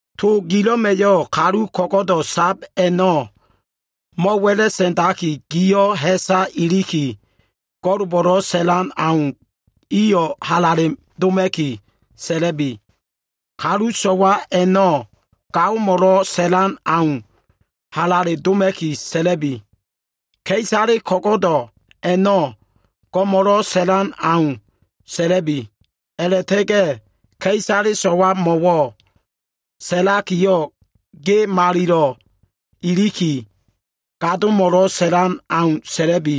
To gilo꞉ma꞉yo꞉ kalu ko꞉go꞉do꞉ sab a꞉no꞉ mo꞉wa꞉la꞉sa꞉ndaki, giyo꞉ ha꞉sa iliki, go꞉lbo꞉lo꞉ sa꞉lan au, iyo꞉ halale doma꞉ki sa꞉la꞉bi. Kalu so꞉wa a꞉no꞉, gaomo꞉lo꞉ sa꞉lan au, halale doma꞉ki sa꞉la꞉bi. Ka꞉isale ko꞉go꞉do꞉ a꞉no꞉, go꞉mo꞉lo꞉ sa꞉lan au, sa꞉la꞉bi. A꞉la꞉ta꞉ga꞉ ka꞉isale so꞉wamo꞉ sa꞉lakiyo꞉, ge malilo꞉ iliki, gadomo꞉lo꞉ sa꞉lan au, sa꞉la꞉bi.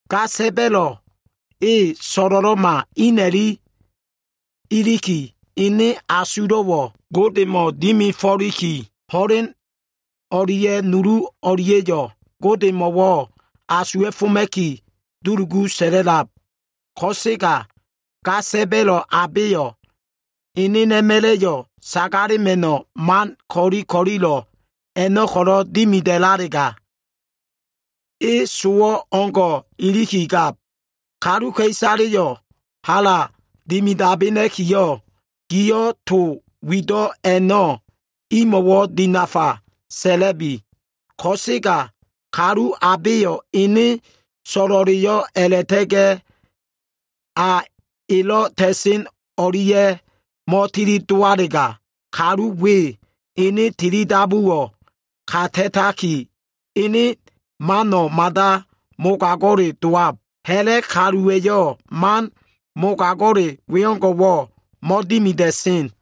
Ga sa꞉ba꞉lo꞉ e so꞉lo꞉lo꞉ma ina꞉lilo꞉ sab a꞉ma꞉yo꞉ ene asulo꞉wo꞉ Godemo꞉ dimifo꞉liki, ho꞉len o꞉lia꞉ nulu o꞉lia꞉yo꞉ Godemo꞉wo꞉ asuwa꞉foma꞉ki, dulugu sa꞉la꞉lab. Ko꞉sega ga sa꞉ba꞉lo꞉ abeyo꞉ enena꞉ma꞉la꞉yo꞉ sagalema꞉no꞉ man ko꞉li ko꞉lilo꞉ a꞉no꞉ko꞉ dimida꞉lalega, e sowo꞉ o꞉ngo꞉ ilikigab. Kaluka꞉isaleyo꞉ hala dimidabena꞉kiyo꞉, giyo꞉ to wido꞉ a꞉no꞉ imo꞉wo꞉ dinafa sa꞉la꞉bi. Ko꞉sega kalu abeyo꞉ ene so꞉lo꞉leyo꞉ a꞉la꞉ta꞉ga꞉ a elo꞉ ta꞉sen o꞉lia꞉yo꞉ mo꞉tilidowalega, kalu we ene tilidabuwo꞉ kata꞉taki, ene mano꞉ mada mogago꞉le dowab. Ha꞉la꞉ kaluwa꞉yo꞉ man mogago꞉le wengo꞉wo꞉ mo꞉dimida꞉sen.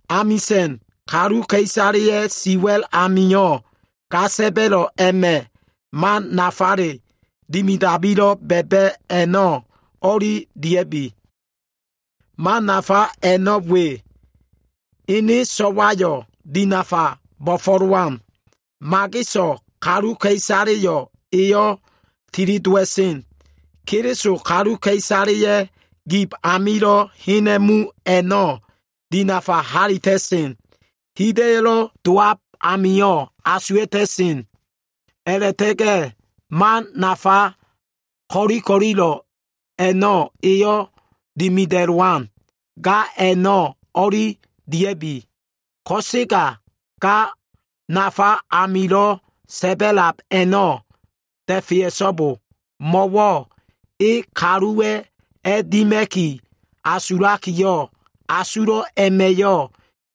Amisa꞉n kaluka꞉isaleya꞉ siwa꞉l amio꞉ ga sa꞉ba꞉lo꞉ a꞉ma꞉ mano꞉ nafale dimidabilo꞉ ba꞉ba꞉ a꞉no꞉ o꞉li dia꞉bi. Man nafa a꞉no꞉ we. Ene so꞉wayo꞉ dinafa bo꞉fo꞉lowan. Mageso꞉ kaluka꞉isaleyo꞉ eyo꞉ tilidowa꞉sen. Keliso kaluka꞉isaleya꞉ gib amio꞉ hena꞉mu a꞉no꞉ dinafa halita꞉sen. Hida꞉yo꞉lo꞉ dowab amio꞉ asuwa꞉ta꞉sen. A꞉la꞉ta꞉ga꞉ man nafa ko꞉li ko꞉lilo꞉ a꞉no꞉ eyo꞉ dimida꞉lowan. Ga a꞉no꞉ o꞉li dia꞉bi. Ko꞉sega ga nafa amilo꞉ sa꞉ba꞉lab a꞉no꞉ da꞉fea꞉so꞉bo. Mo꞉wo꞉ e kaluwa꞉ a꞉dima꞉ki asulakiyo꞉, asulo꞉ a꞉ma꞉yo꞉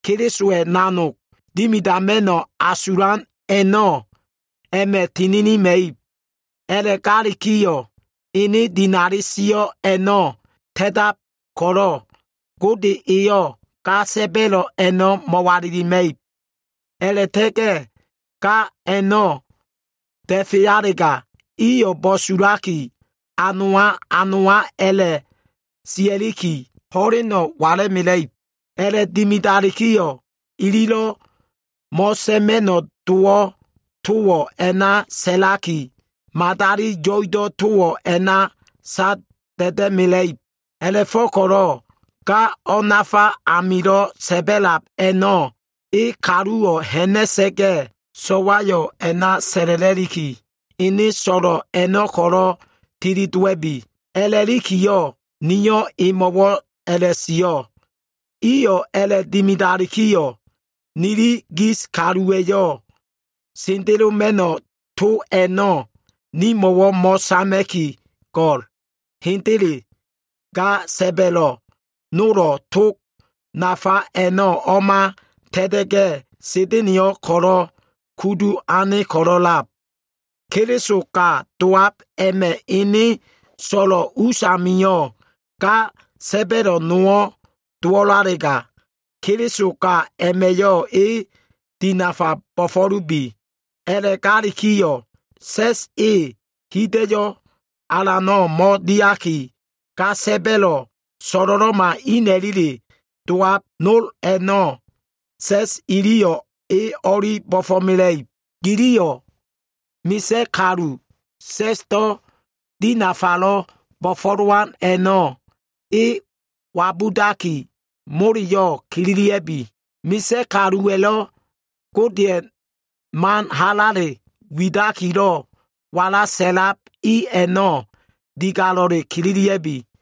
Kelisowa꞉ nanog dimidama꞉no꞉ asulan a꞉no꞉ a꞉ma꞉ tininima꞉ib. A꞉la꞉galikiyo꞉, ene dinali sio꞉ a꞉no꞉ ta꞉tab ko꞉lo꞉, Gode eyo꞉ ga sa꞉ba꞉lo꞉ a꞉no꞉ mo꞉walilima꞉ib. A꞉la꞉ta꞉ga꞉ ga a꞉no꞉ da꞉fealega, iyo꞉ bo꞉sulaki, a nowa, a nowa a꞉la꞉ sia꞉liki, ho꞉leno꞉ wala꞉mela꞉ib. A꞉la꞉dimida꞉lalikiyo꞉, ililo꞉ mo꞉sa꞉ma꞉no꞉ dowo꞉ towo꞉ a꞉na sa꞉laki, madali yo꞉ido꞉ towo꞉ a꞉na sada꞉da꞉mela꞉ib. A꞉la꞉fo꞉ko꞉lo꞉ ga o꞉nafa amilo꞉ sa꞉ba꞉lab a꞉no꞉ e kaluwo꞉ ha꞉na꞉sa꞉ga꞉, so꞉wayo꞉ a꞉na sa꞉la꞉la꞉liki, ene so꞉lo꞉ a꞉no꞉ ko꞉lo꞉ tilidowa꞉bi, a꞉la꞉likiyo꞉ niyo꞉ emo꞉wo꞉ a꞉la꞉sio꞉. Iyo꞉ a꞉la꞉dimidalikiyo꞉, nili gis kaluwa꞉yo꞉ sendeloma꞉no꞉ to a꞉no꞉ nimo꞉wo꞉ mo꞉sama꞉ki go꞉l. Hendele. Ga sa꞉ba꞉lo꞉ nolo꞉ tog nafa a꞉no꞉ o꞉ma ta꞉ta꞉ga꞉, Sa꞉da꞉na꞉yo꞉ ko꞉lo꞉ kudu ane ko꞉lo꞉ a꞉lab. Keliso ga dowab a꞉ma꞉ ene so꞉lo꞉ us amio꞉ ga sa꞉ba꞉lo꞉ nowo꞉ dowalega, Keliso ga a꞉ma꞉yo꞉ e dinafa bo꞉fo꞉lubi. A꞉la꞉galikiyo꞉, sa꞉s e hida꞉yo꞉ alano꞉ mo꞉diaki, ga sa꞉ba꞉lo꞉ so꞉lo꞉lo꞉ma ina꞉lile dowab nol a꞉no꞉ sa꞉s iliyo꞉ e o꞉li bo꞉fo꞉mela꞉ib. Giliyo꞉ sa꞉sdo꞉ bo꞉fo꞉lowan kalu i a꞉no꞉ wabudaki, moleyo꞉ kililia꞉bi. Misa꞉ kaluwa꞉lo꞉ Godeya꞉ mano꞉ halale widakilo꞉ wala sa꞉lab i a꞉no꞉, digalo꞉le kililia꞉bi.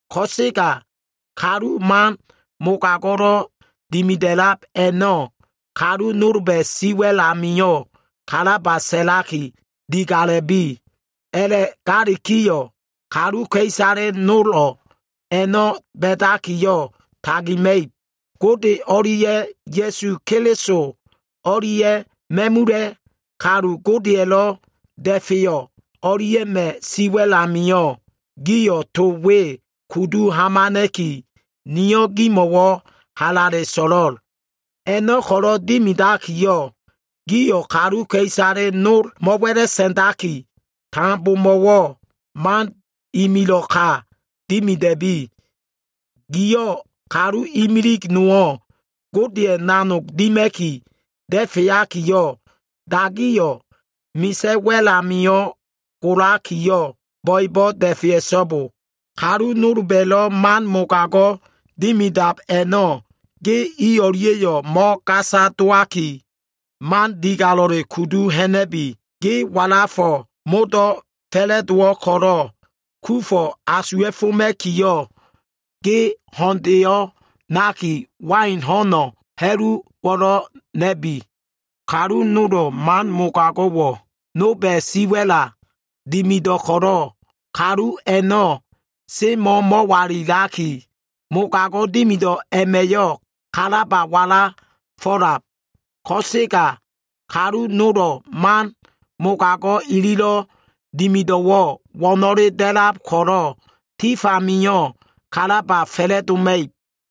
Ko꞉sega kalu man mogago꞉lo꞉ dimida꞉lab a꞉no꞉, kalu nolba꞉ siwa꞉l amio꞉ kalaba sa꞉laki, digala꞉bi. A꞉la꞉galikiyo꞉, kaluka꞉isale nolo꞉ a꞉no꞉ ba꞉dakiyo꞉ tagima꞉ib. Gode o꞉lia꞉ Ya꞉su Keliso o꞉lia꞉ ma꞉mula꞉ kalu Godeya꞉lo꞉ da꞉feyo꞉ o꞉lia꞉ma꞉ siwa꞉l amio꞉, giyo꞉ to we kudu hamana꞉ki, niyo꞉ gemo꞉wo꞉ halale so꞉lo꞉l. A꞉no꞉ ko꞉lo꞉ dimidakiyo꞉, giyo꞉ kaluka꞉isale nolo꞉ mo꞉wa꞉la꞉sa꞉ndaki, tambomo꞉wo꞉ man imilo꞉ ka dimida꞉bi. Giyo꞉ kalu imilig nowo꞉ Godeya꞉ nanog dima꞉ki da꞉feakiyo꞉, dagiyo꞉ misa꞉ wa꞉l amio꞉ golakiyo꞉, bo꞉ebo꞉ da꞉fea꞉so꞉bo. Kalu nolba꞉lo꞉ man mogago꞉ dimidab a꞉no꞉, ge i o꞉lia꞉yo꞉ mo꞉gasa dowaki, mano꞉ digalo꞉le kudu ha꞉na꞉bi. Ge walafo꞉ modo꞉ fa꞉la꞉dowo꞉ ko꞉lo꞉, kufo꞉ asuwa꞉foma꞉kiyo꞉, ge ho꞉ndeyo꞉ nakiyo꞉, wain ho꞉n ha꞉luwo꞉lo꞉ na꞉bi. Kalu nolba꞉yo꞉ man mogago꞉wo꞉ nolba꞉ siwa꞉la dimida꞉len ko꞉lo꞉, kalu a꞉no꞉ semo꞉ mo꞉walilaki, mogago꞉ dimido꞉ a꞉ma꞉yo꞉ kalaba dowo꞉ ko꞉lo꞉lab. Ko꞉sega kalu nolo꞉ man mogago꞉ ililo꞉ dimido꞉wo꞉ wo꞉no꞉le da꞉lab ko꞉lo꞉, tif amio꞉ kalaba fa꞉la꞉doma꞉ib.